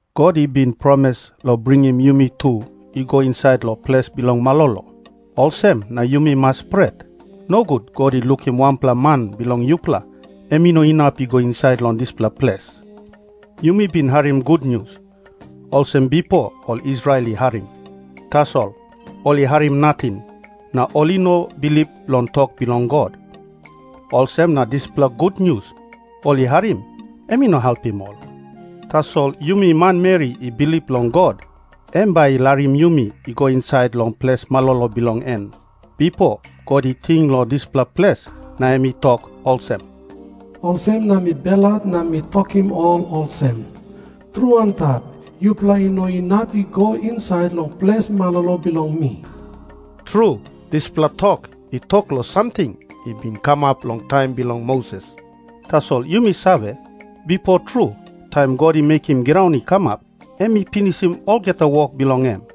God i bin promis long bringim yumi tu i go insait long ples bilong malolo. Olsem na yumi mas pret, nogut God i lukim wanpela man bilong yupela em i no inap i go insait long dispela ples. Yumi bin harim gutnius, olsem bipo ol Israel i harim. Tasol ol i harim nating, na ol i no bilip long tok bilong God. Olsem na dispela gutnius ol i harim, em i no helpim ol. Tasol yumi manmeri i bilip long God, em bai i larim yumi i go insait long ples malolo bilong en. Bipo God i ting long dispela ples na em i tok olsem, “Olsem na mi belhat na mi tokim ol olsem, ‘Tru antap, yupela i no inap i go insait long ples malolo bilong mi.’” Tru, dispela tok i tok long samting i bin kamap long taim bilong Moses, tasol yumi save, bipo tru, taim God i mekim graun i kamap, em i pinisim olgeta wok bilong en.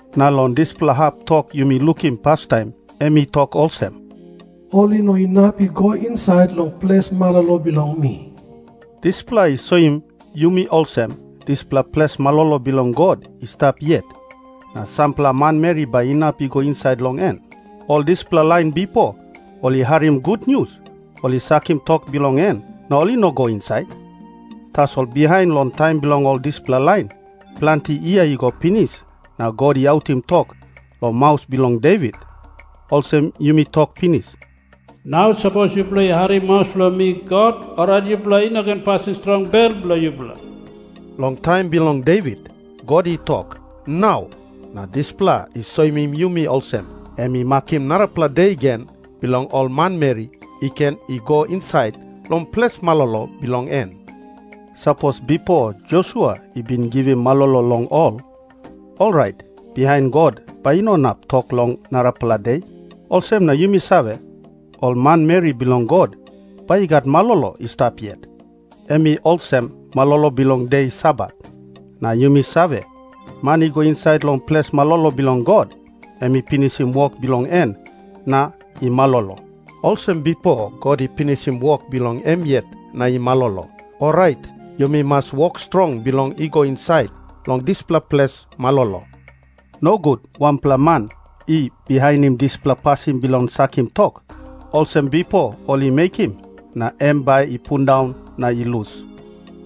Na long dispela hap tok yumi lukim pastaim em i tok olsem, “Ol i no inap i go insait long ples malolo bilong mi.” Dispela i soim yumi olsem, dispela ples malolo bilong God i stap yet, na sampela manmeri bai inap i go insait long en. Ol dispela lain bipo ol i harim gutnius, ol i sakim tok bilong en, na ol i no i go insait. Tasol bihain long taim bilong ol dispela lain, planti yia i go pinis na God i autim tok long maus bilong Devit, olsem yumi tok pinis, “Nau sapos yupela i harim maus bilong mi God, orait yupela i no ken pasim strong bel bilong yupela.” Long taim bilong Devit, God i tok “Nau”, na dispela i soim yumi olsem, em i makim narapela de gen bilong ol manmeri i ken i go insait long ples malolo bilong en. Sapos bipo Josua i bin givim malolo long ol, orait bihain God bai i no inap tok long narapela de. Olsem na yumi save, ol manmeri bilong God bai i gat malolo i stap yet, em i olsem malolo bilong de Sabat. Na yumi save, man i go insait long ples malolo bilong God, em i pinisim wok bilong en na i malolo, olsem bipo God i pinisim wok bilong em yet na i malolo. Orait yumi mas wok strong bilong i go insait long dispela ples malolo. Nogut wanpela man i bihainim dispela pasin bilong sakim tok, olsem bipo ol i mekim, na em bai i pundaun na i lus.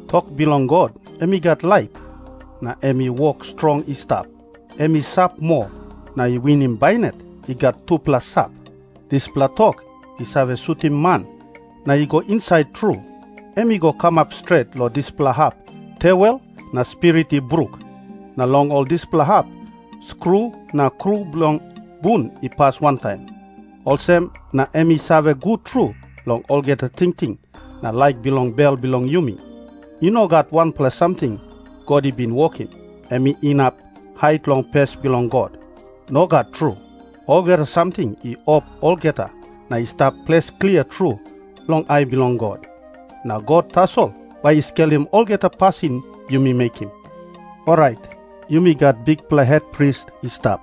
Tok bilong God em i gat laip, na em i wok strong i stap. Em i sap moa, na i winim bainat i gat tupela sap. Dispela tok i save sutim man na i go insait tru. Em i go kamap stret long dispela hap tewel na spirit i bruk, na long ol dispela hap skru na kru bilong bun i pas wantaim. Olsem na em i save gut tru long olgeta tingting na laik bilong bel bilong yumi. I no gat wanpela samting God i bin wokim, em inap hait long pes bilong God. Nogat tru. Olgeta samting i op olgeta na i stap ples klia tru long ai bilong God. Na God tasol bai i skelim olgeta pasin yumi mekim. Orait yumi gat bikpela hetpris i stap,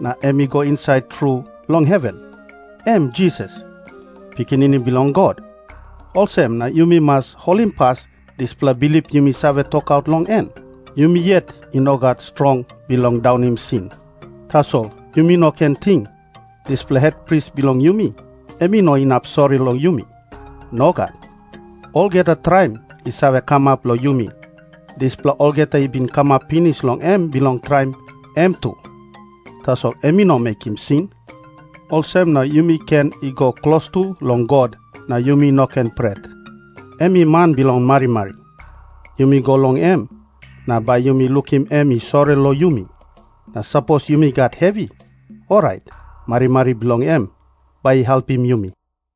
na em i go insait tru long heven. Em Jisas, Pikinini Bilong God. Olsem na yumi mas holimpas dispela bilip yumi save tokaut long en. Yumi yet i no gat strong bilong daunim sin. Tasol yumi no ken ting, dispela hetpris bilong yumi em i no inap sori long yumi. Nogat. Olgeta traim i save kamap long yumi, dispela olgeta i bin kamap pinis long em bilong traim em tu. Tasol em i no mekim sin. Olsem na yumi ken i go klostu long God, na yumi no ken pret. Em i man bilong marimari. Yumi go long em, na bai yumi lukim em i sori long yumi. Na sapos yumi gat hevi, orait marimari bilong em bai i helpim yumi.